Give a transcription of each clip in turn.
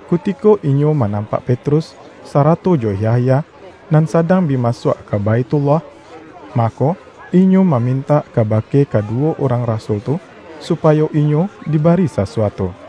Kutiko inyo manampak Petrus, sarato jo Yahya nan sadang bi masuak ka Baithullah, mako, inyo mamintak kabake kaduwo urang rasul tu, supayo inyo dibari sasuatu.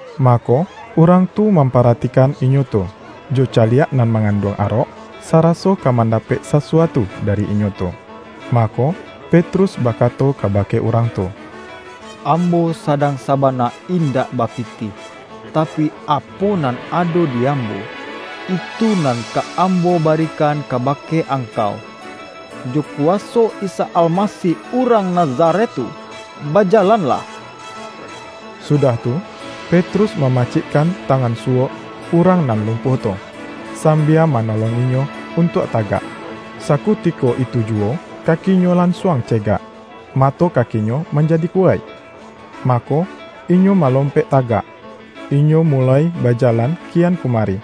Mako, urang tu mamparatikan inyo tu, jo caliak nan manganduang arok, saraso ka mandapek sasuatu dari inyo tu. Mako, Petrus bakato kabake urang tu,”Ambo sadang sabana indak bapitih. Tapi, apo nan ado di ambo, itu nan ka ambo barikan kabake angkau: Jo kuwaso Isa Almasih urang Nazaret tu, bajalanlah!” Sudah tu, Petrus mamacikkan tangan suwok urang nan lumpuah tu, sambia manolong inyo untuak tagak. Sakutiko itu juwo kakinyo lansuang cegak, mato kakinyo manjadi kuwaik. Mako, inyo malompek tagak, inyo muloi bajalan kian kumari.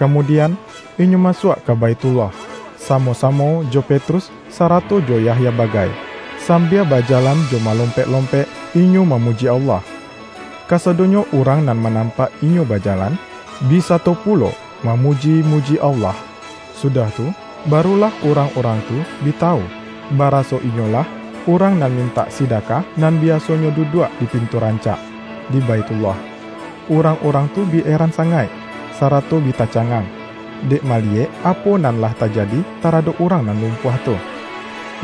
Kamudian inyo masuak ka Baithullah, samo-samo jo Petrus sarato jo Yahya bagai, sambia bajalan jo malompek-lompek inyo mamuji Allah. Kasadonyo urang nan manampak inyo bajalan, bi sato pulo mamuji-muji Allah. Sudah tu, barulah urang-urang tu bi tawu, baraso inyolah urang nan mintak sidakah, nan biasonyo duduak di”Pintu Rancak” di Baithullah. Urang-urang tu bi eran sangaik, sarato bi tacangang, dek maliyek apo nan lah tajadi taradok urang nan lumpuah tu.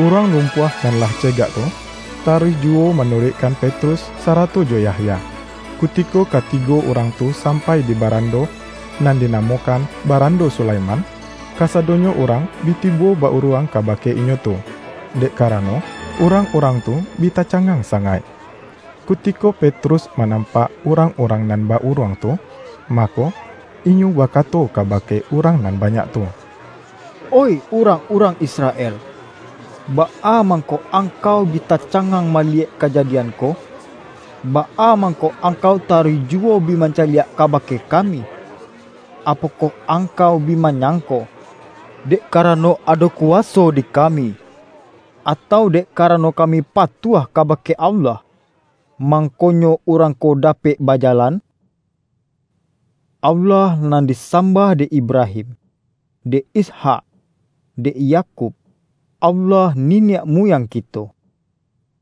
Urang lumpuah nan lah cegak tu, taruih juwo manuruikkan Petrus, sarato jo Yahya. Kutiko katigo urang tu sampai di barando nan dinamokan”Barando Sulaiman”, kasadonyo urang bi tibo ba-uruang kabake inyo tu, dek karano, urang-urang tu bi tacangang sangaik. Kutiko Petrus manampak urang-urang nan ba-uruang tu, mako, inyo bakato kabake urang nan banyak tu,”Oih urang-urang Israel, baa mangko angkau bi tacangang maliyek kajadian ko? Baa mangko angkau taruih juwo bi mancaliak kabake kami? Apokoh angkau bi manyangko, dek karano ado kuwaso di kami, atau dek karano kami patuah kabake Allah, mangkonyo urang ko dapek bajalan? Allah nan disambah dek Ibrahim, dek Ishak, dek Yakub, Allah niniak muyang kito,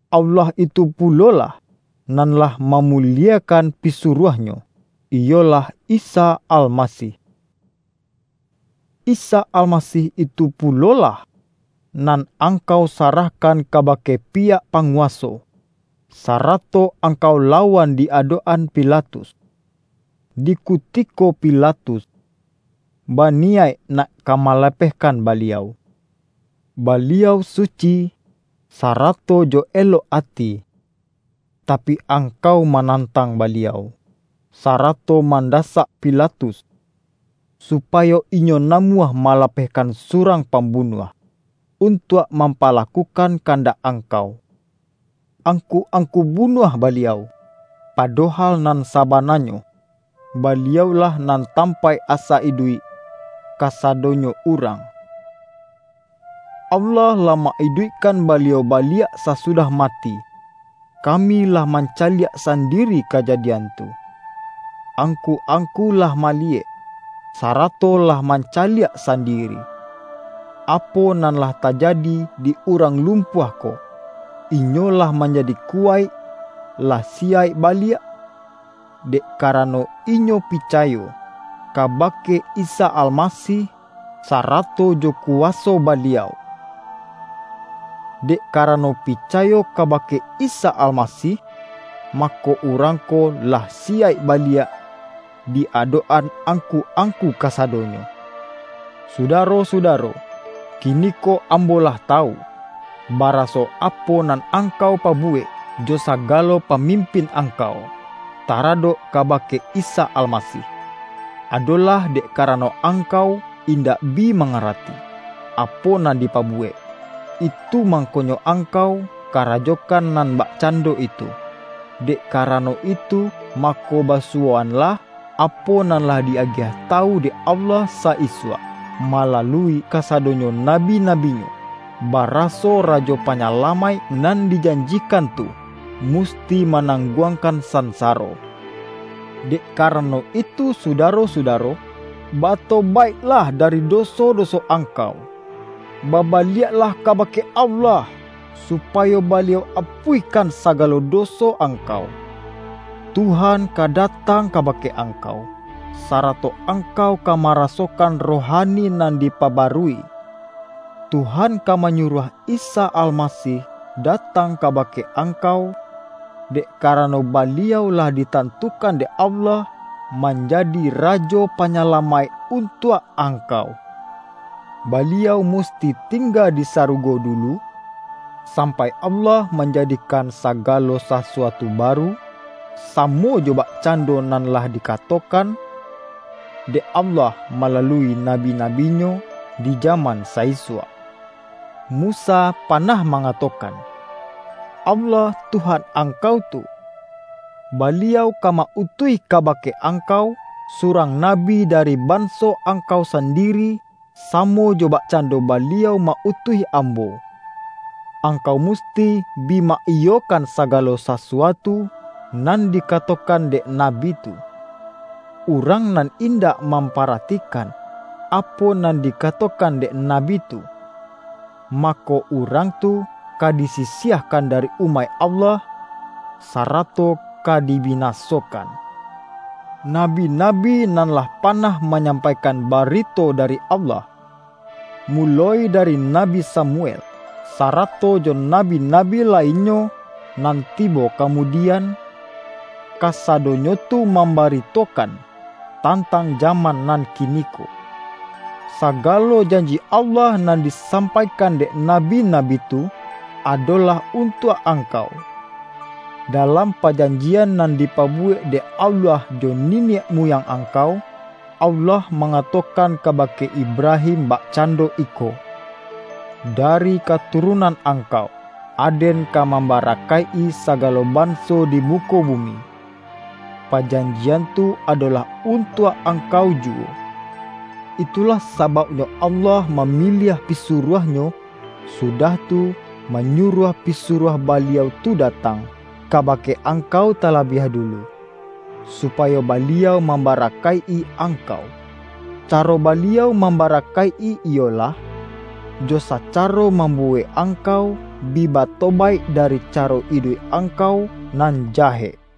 Allah itu pulolah, nan lah mamuliekan Pisuruah-Nyo, iyolah Isa Almasih. Isa Almasih itu pulolah nan angkau sarahkan kabake piyak panguwaso, sarato angkau lawan di adok-an Pilatus, di kutiko Pilatus baniyaik nak ka malapehkan Baliau. Baliau suci, sarato jo elok ati, tapi, angkau manantang Baliau, sarato mandasak Pilatus, supayo inyo namuah malapehkan surang pambunuah, untuak mampalakukan kandak angkau. Angku-angku bunuah Baliau, padohal nan sabananyo, Baliau-lah nan tampaik asa iduik kasadonyo urang. Allah lah ma-iduikkan Baliau baliak sasudah mati. Kami lah mancaliak sandiri kajadian tu. Angku-angku lah maliyek, sarato lah mancaliak sandiri, apo nan lah tajadi di urang lumpuah ko. Inyo lah manjadi kuwaik, lah siyaik baliak, dek karano inyo picayo kabake Isa Almasih sarato jo kuwaso Baliau. Dek karano picayo kabake Isa Almasih, mako urang ko lah siyaik baliak di adok-an angku-angku kasadonyo. Sudaro-sudaro! Kiniko ambo lah tawu, baraso, apo nan angkau pabuwek jo sagalo pamimpin angkau, taradok kabake Isa Almasih, adolah dek karano angkau indak bi mangarati, apo nan dipabuwek, itu mangkonyo angkau karajokan nan bakcando itu. Dek karano itu, mako basuwoanlah apo nan lah di-agiah tawu dek Allah sa-isuak, malalui kasadonyo nabi-nabi-Nyo, baraso Rajo Panyalamaik nan dijanjikan tu, musti manangguangkan sansaro. Dek karano itu sudaro-sudaro, batobaiklah dari doso-doso angkau, babaliaklah kabake Allah, supayo Baliau apuihkan sagalo doso angkau. Tuhan ka datang kabake angkau, sarato angkau ka marasokan rohani nan dipabarui. Tuhan ka manyuruah Isa Almasih datang kabake angkau, dek karano Baliau lah ditantukan dek Allah manjadi Rajo Panyalamaik untuak angkau. Baliau musti tingga di sarugo dulu, sampai Allah manjadikan sagalo sasuatu baru, samo jo bakcando nan lah dikatokan dek Allah malalui nabi-nabi-Nyo di jaman sa-isuak. Musa panah mangatokan, ’Allah, Tuhan angkau tu, Baliau ka ma-utuih kabake angkau, surang nabi dari banso angkau sandiri, samo jo bakcando Baliau ma-utuih ambo. Angkau musti bi ma-iyokan sagalo sasuatu nan dikatokan dek nabi tu. Urang nan indak mamparatikan apo nan dikatokan dek nabi tu, mako, urang tu ka disisiahkan dari umaik Allah, sarato ka dibinasokan.’ Nabi-nabi nan lah panah manyampaikan barito dari Allah, muloi dari Nabi Samuel, sarato jo nabi-nabi lainnyo nan tibo kamudian, kasadonyo tu mambaritokan tantang jaman nan kiniko. Sagalo janji Allah nan disampaikan dek nabi-nabi tu, adolah untuak angkau. Dalam pajanjian nan dipabuwek dek Allah jo niniak muyang angkau, Allah mangatokan kabake Ibrahim bakcando iko, ’Dari katurunan angkau, Aden ka mambarakaik-i sagalo banso di muko bumi.’ Pajanjian tu adolah untuak angkau juwo. Itulah sabauknyo Allah mamiliah Pisuruah-Nyo, sudah tu, manyuruah Pisuruah Baliau tu datang kabake angkau talabiah dulu, supayo Baliau mambarakaik-i angkau. Caro Baliau mambarakaik-i iyolah, jo sacaro mambuwek angkau bi batobaik dari caro iduik angkau nan jahek.” RIWAYAIK RASUL-RASUL